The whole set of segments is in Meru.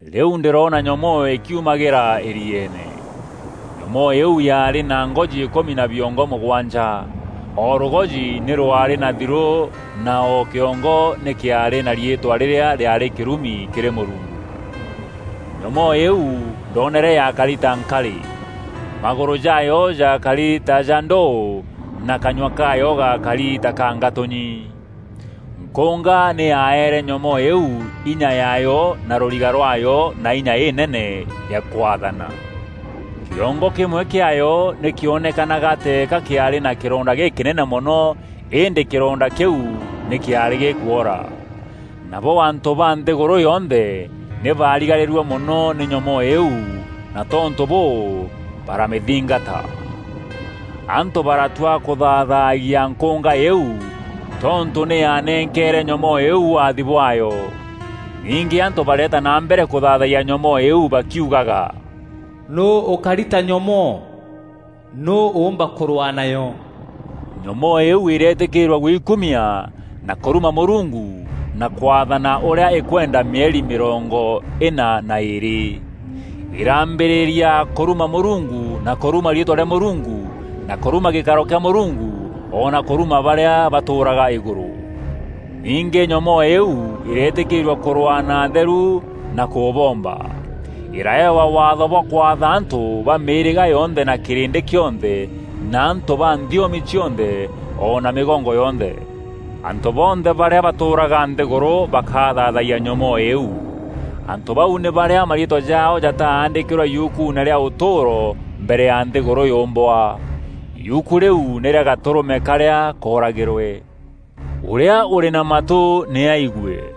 Rîu ndîroona nyomoo îkiumagîra îrieene. Nyomoo îîu yaarî na ngoji îkûmi na biongo mûgwanja. O rûgoji nî rwaarî na thirû na o kiongo nî kîaarî na riîtwa rîrîa rîaarî kîrumi kîrî Mûrungu. Nyomoo îîu ndoonere yaakari ta nkarî. Magûrû jaayo jaakari ta ja ndûû na kanyua kaayo gaakari ta ka ngatûnyi. Nkûnga nî yaeere nyomoo îîu inya yaayo na rûriga rwaayo na inya înene ya kwaathana. Kîongo kîmwe kîaayo nî kîonekanaga teeka kîaarî na kîronda gîkînene mono îndî kîronda kîu nî kîaarî gîkwora. Nabo antû ba nthîgûrû yonthe nî baarigarîrue mono nî nyomoo îîu na tontû bûû baramîthingata. Antû baratua kûthaathagia nkûnga îîu tontû nî yanenkeere nyomoo îîu waathi bwaayo. Ningî antû bareeta na mbere kûthaathayia nyomoo îîu bakiugaga, “Nûû ûkari ta nyomoo? Nûû ûûmba kûrwaa nayo?” Nyomoo îîu îreetîkîîrua gwikumia na kûruma Mûrungu na kwaathana ûrîa îkwenda mîeri mîrongo îna na îîrî. Îrambîrîria kûruma Mûrungu na kûruma riîtwa rîa Mûrungu na kûruma gîkaro kîa Mûrungu o na kûruma barîa batûûraga îgûrû. Ningî nyomoo îîu îreetîkîîrua kûrwaa na atheru na kûboomba. Îraeewa waatho bwa kwatha antû ba mîîrîga yonthe na kîrîndî kîonthe na antû ba nthiomi cionthe o na mîgongo yonthe. Antû bonthe barîa batûûraga nthîgûrû bakathaathayia nyomoo îîu. Antû bau nî barîa mariîtwa jaao jataandîkîrwe yukuune rîa ûtûûro mbere ya nthîgûrû yûmbwa. Yuku rîu nî rîa Gatûrûme karîa kooragîrwe. “Ûrîa ûrî na matû nî aigue: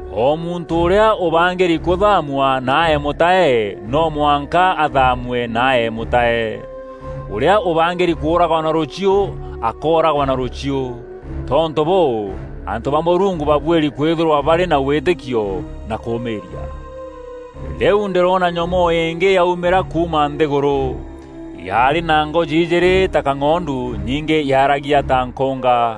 O muntû ûrîa ûbangîri kûthaamua na aee mûtae, no mwanka athaamue na aee mûtae. Ûrîa ûbangîri kûûragwa na rûchiû, akooragwa na rûchiû. Tontû bûû antû ba Mûrungu babuîri kwîthîrwa barî na wîtîkio na kûûmîîria.” Rîu ndîroona nyomoo îngî yaumîra kuuma nthîgûrû. Yaarî na ngoji ijîîrî ta kang'ondu, ningî yaaragia ta nkûnga.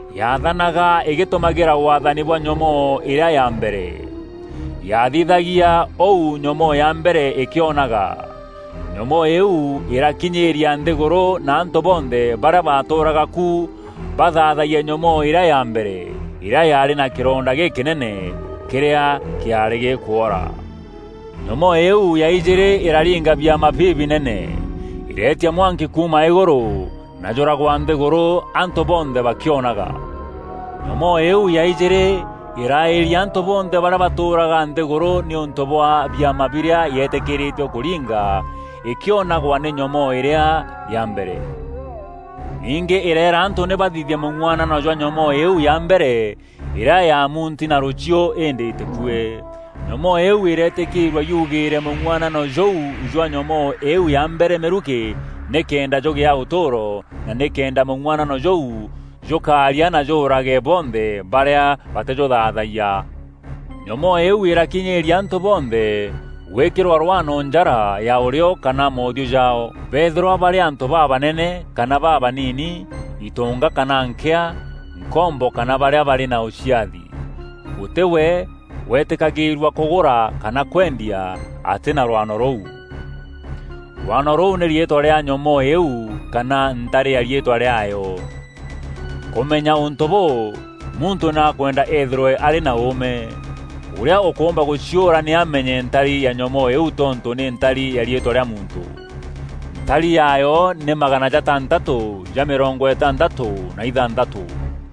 Yaathanaga îgîtumagîra waathani bwa nyomoo îrîa ya mbere. Yaathithagia ûu nyomoo ya mbere îkîonaga. Nyomoo îîu îrakinyîîria nthîgûrû na antû bonthe barîa batûûraga ku bathaathayie nyomoo îrîa ya mbere, îrîa yaarî na kîronda gîkînene, kîrîa kîaarî gîkûora. Nyomoo îîu ya ijîîrî îraringa biama bibinene: îreetia mwanki kuuma îgûrû na jûragwa nthîgûrû antû bonthe bakîonaga. Nyomoo îîu ya ijîîrî îraîria antû bonthe barîa batûûraga nthîgûrû nîûntû bwa biama birîa yeetîkîrîîtue kûringa îkîonagwa nî nyomoo îrîa ya mbere. Ningî îreera antû nî bathithie mûng'uanano jwa nyomoo îîu ya mbere îrîa yaamunti na rûchiû îndî îtîkue. Nyomoo îîu îreetîkîîrua yugîîre mûng'uanano jûu jwa nyomoo îîu ya mbere mîrukî nîkenda jûgîa ûtûûro na nîkenda mûng'uanano jûu jûkaaria na jûûrage bonthe barîa batîjûthaathayia. Nyomoo îîu îrakinyîîria antû bonthe gwîkîrwa rwano njara ya ûrîo kana moothiû jaao: bëethîrwa barî antû babanene kana babaniini, itonga kana nkîa, nkombo kana barîa barî na ûciathi. Gûtî we weetîkagîîrua kûgûra kana kwendia atî na rwano rûu. Rwano rûu nî riîtwa rîa nyomoo îîu kana ntari ya riîtwa rîaayo. Kûmenya ûntû bûû, muntû nî akwenda eethîrwe arî na ûûme. Ûrîa ûkûûmba gûciûra nî amenye ntari ya nyomoo îîu tontû nî ntari ya riîtwa rîa muntû. Ntari yaayo nî magana jatantatû ja mîrongo îtantatû na îthanthatû.